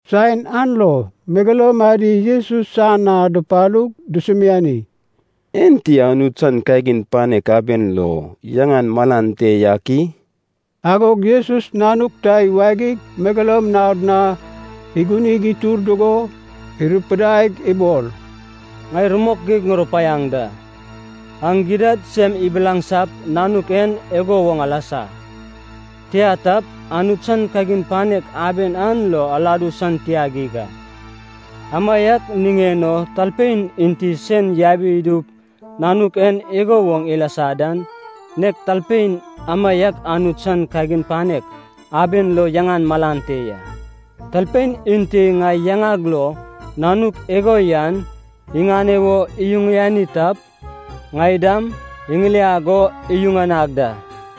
Saen an lo megeloum adi Jesus san na dupalug dusumiani, “Enti Anut san kagin panek aben lo yaŋan malan te yak i?” Agog Jesus nanuk ta iwagig megeloum naod na igunig itur dugo irupidaig ibol, “Ŋai rumok geig ŋurupaiaŋ da, aŋ gidad sem ibilaŋsap nanuk en igo woŋ alasa. Tia tap, Anut san kagin panek aben an lo aladu san tia geig a. Amaiak niŋen o talpein enti sen yabi idup nanuk en igo woŋ ilasa dan, nek talpein amaiak Anut san kagin panek aben lo yaŋan malan te ya. “Talpein enti ŋai yaŋag lo nanuk igo yan iŋane wo iyuŋani tap, ŋai dam iŋiliag o iyuŋanag da.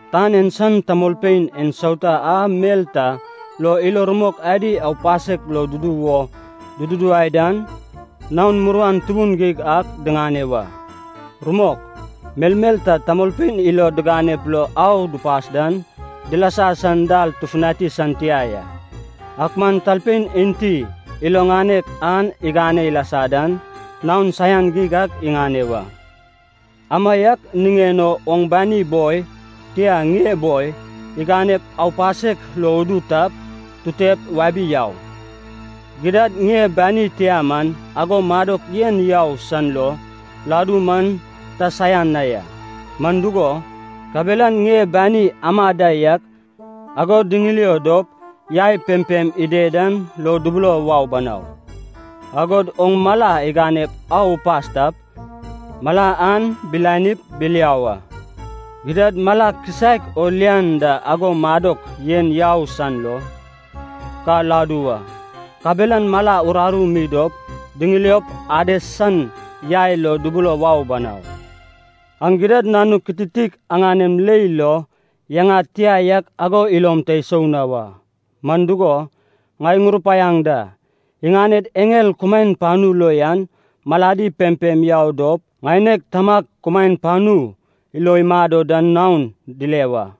“Tan en san tamolpein ensauta a mel ta lo ilo rumok adi aupasek lo dudu wo dududuwai dan, naon muruan tubun geig ak diŋane wa! Rumok, melmel ta tamolpein ilod diŋanep lo au dupas dan, dilasa san dal tufutani san tia ya. Ak man talpein enti ilo ŋanek an igane ilasa dan, naon saian geig ak iŋane wa! Amaiak niŋen o oŋ bani boi, tia, ŋie boi, iganep aupasek lo udu tap, tutep wabi yau! Gidad ŋie bani tia man ago madok yen yau san lo ladu man ta saian na ya, man dugo, kabelan ŋie bani ama da yak ago diŋilio dop yai pempem ided dan lo dubulo wau banau. Agod oŋ mala iganep au upas tap, mala an bilanip biliau a. Gidad mala kisaek o lian da ago madok yen yau san lo ka ladu wa. Kabelan mala uraru mi dop diŋiliop Ades san yai lo dubulo wau banau. “Aŋ gidad nanuk kititik aŋanem leil lo yaŋad tia yak ago ilom ta isou na wa. Man dugo, ŋai ŋurupaiaŋ da, iŋaned eŋel kumaen panu lo yan maladi pempem yau dop ŋaineg Tamag kumaen panu lo imado dan naon dile da.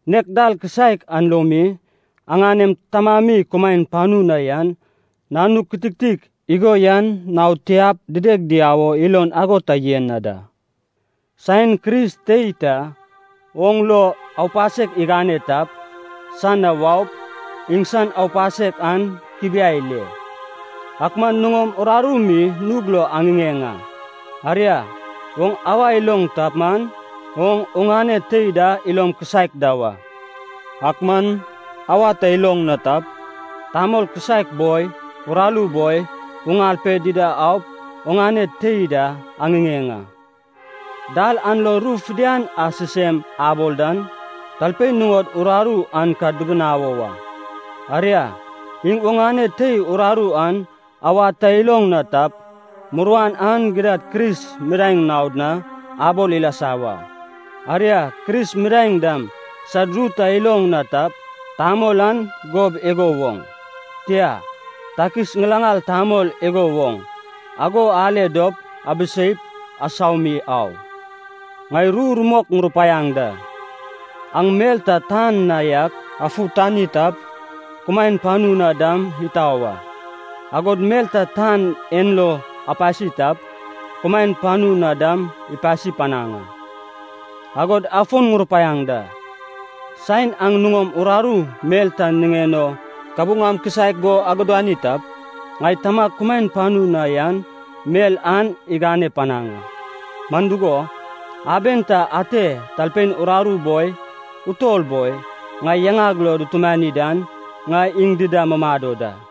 Nek dal kisaek an lo mi, aŋanem Tamami kumaen panu na yan, nanuk kititik igo yan naod tiap dideg diau o ilon ago ta yen na da.” “Saen Kris tei ta oŋ lo aupasek igane tap, san na waup iŋsan aupasek an kibiai ile. Ak man nuŋom uraru mi nug lo aŋiŋeŋ a. Aria, oŋ awa iloŋ tap man, oŋ oŋane tei da ilom kisaek da wa. Ak man awa ta iloŋ na tap, tamol kisaek boi, uraru boi, uŋal pe dida aup oŋane tei da aŋiŋeŋ a. Dal an lo ru fidian a sisem abol dan, talpein nuŋod uraru an ka dibinawo wa. Aria, iŋ oŋane tei uraru an awad ta iloŋ na tap, muruan an gidad Kris midaeŋ naod na abol ilasa wa. Aria, Kris midaeŋ dam sad ru ta iloŋ na tap, tamol an gob igo woŋ, tia, takis ŋilaŋal tamol igo woŋ, ago ale dop abiseip asau mi au. “Ŋai ru rumok ŋurupaiaŋ da, aŋ mel ta tan na yak afutani tap, kumaen panu na dam itau a, agod mel ta tan en lo apasi tap, kumaen panu na dam ipasi panaŋ a. “Agod afon ŋurupaiaŋ da, saen aŋ nuŋom uraru mel ta niŋen o kabuŋam kisaek go agudani tap, ŋai Tamag kumaen panu na yan mel an igane panaŋ a. Man dugo, aben ta ate talpein uraru boi, utol boi, ŋai yaŋag lo dutumani dan, ŋai iŋ dida mumado da.”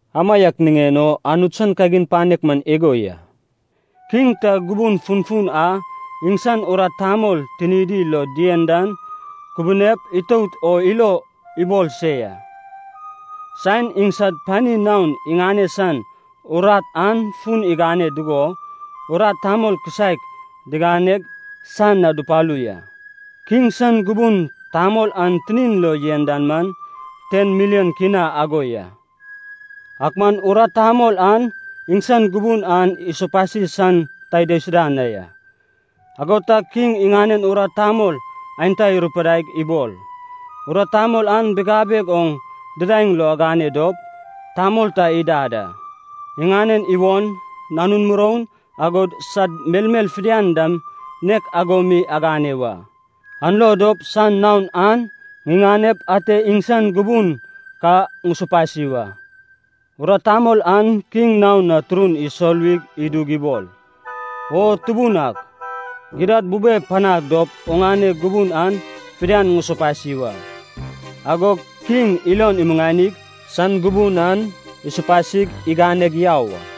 “Amaiak niŋen o Anut san kagin panek man igo ya. Kiŋ ta gubun funfun a iŋsan urat tamol tinidi lo dien dan ikubunep itout o ilon ibol se ya. Saen iŋsad pani naon iŋane san urat an fun igane dugo, urat tamol kisaek diŋaneg san na dupalu ya. Kiŋ san gubun tamol an tinin lo yen dan man ten milion kina ago ya. Ak man urat tamol an iŋsan gubun an isopasi san ta idaisuda na ya. Ago tag kiŋ iŋanen urat tamol aenta irupidaig ibol, ‘urat tamol an bigabeg oŋ didaeŋ lo agane dop, tamol ta idad a. Iŋanen iwon, nanun muroun, agod sad melmel fidian dam nek ago mi agane wa. An lo dop san naon an ŋiŋanep ate iŋsan gubun ka ŋusopasi wa.’ “Urat tamol an kiŋ naon na turun isoluwi idug ibol, ‘O Tubun ak, gidad bube panag dop oŋane gubun an fidian ŋusopasi wa.’ Agog kiŋ ilon imuŋanig san gubun an isopasig iganeg yau a.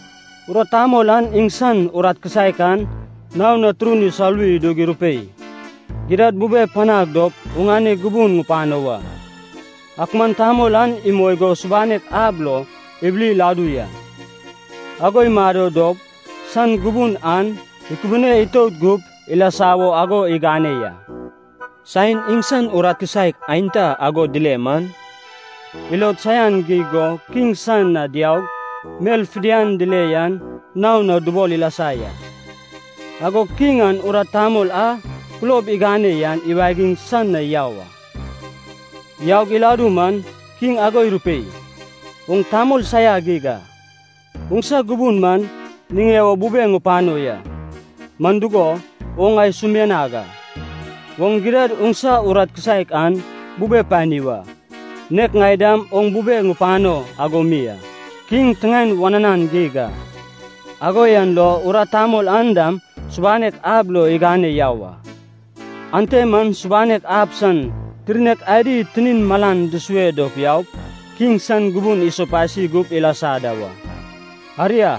“Urat tamol an iŋsan urat kisaek an naon na turun isoluwi idug irupei, ‘Gidad bube panag dop oŋane gubun ŋupano wa.’ “Ak man tamol an imoi go subanek ab lo ibili iladu ya. Ago imado dop san gubun an ikubune itout gup ilasa wo ago igane ya. Saen iŋsan urat kisaek aenta ago dile man, ilod saian geig go kiŋ san na diaug mel fidian dile yan naon na dubol ilasa ya. “Agog kiŋ an urat tamol a kulob igane yan iwagig san na yau a. Yaug iladu man kiŋ ago irupei, ‘Oŋ tamol saia geig a, oŋsa gubun man niŋen o bubeg ŋupano ya, man dugo, oŋ ŋai sumianag a. Oŋ gidad oŋsa urat kisaek an bube pani wa, nek ŋai dam oŋ bubeg ŋupano ago mi a.’ Kiŋ tiŋaen wananan geig a, ago yan lo urat tamol an dam subanek ab lo igane yau a. Ante man subanek ab san tirnek adi tinin malan dusue dop yaup, kiŋ san gubun isopasi gup ilasa da wa. “Aria,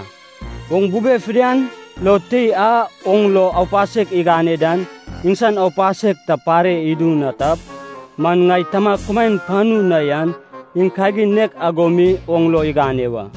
oŋ bube fidian lo tei a oŋ lo aupasek igane dan iŋsan aupasek ta pare idu na tap, man ŋai Tamag kumaen panu na yan iŋ kagin nek ago mi oŋ lo igane wa.”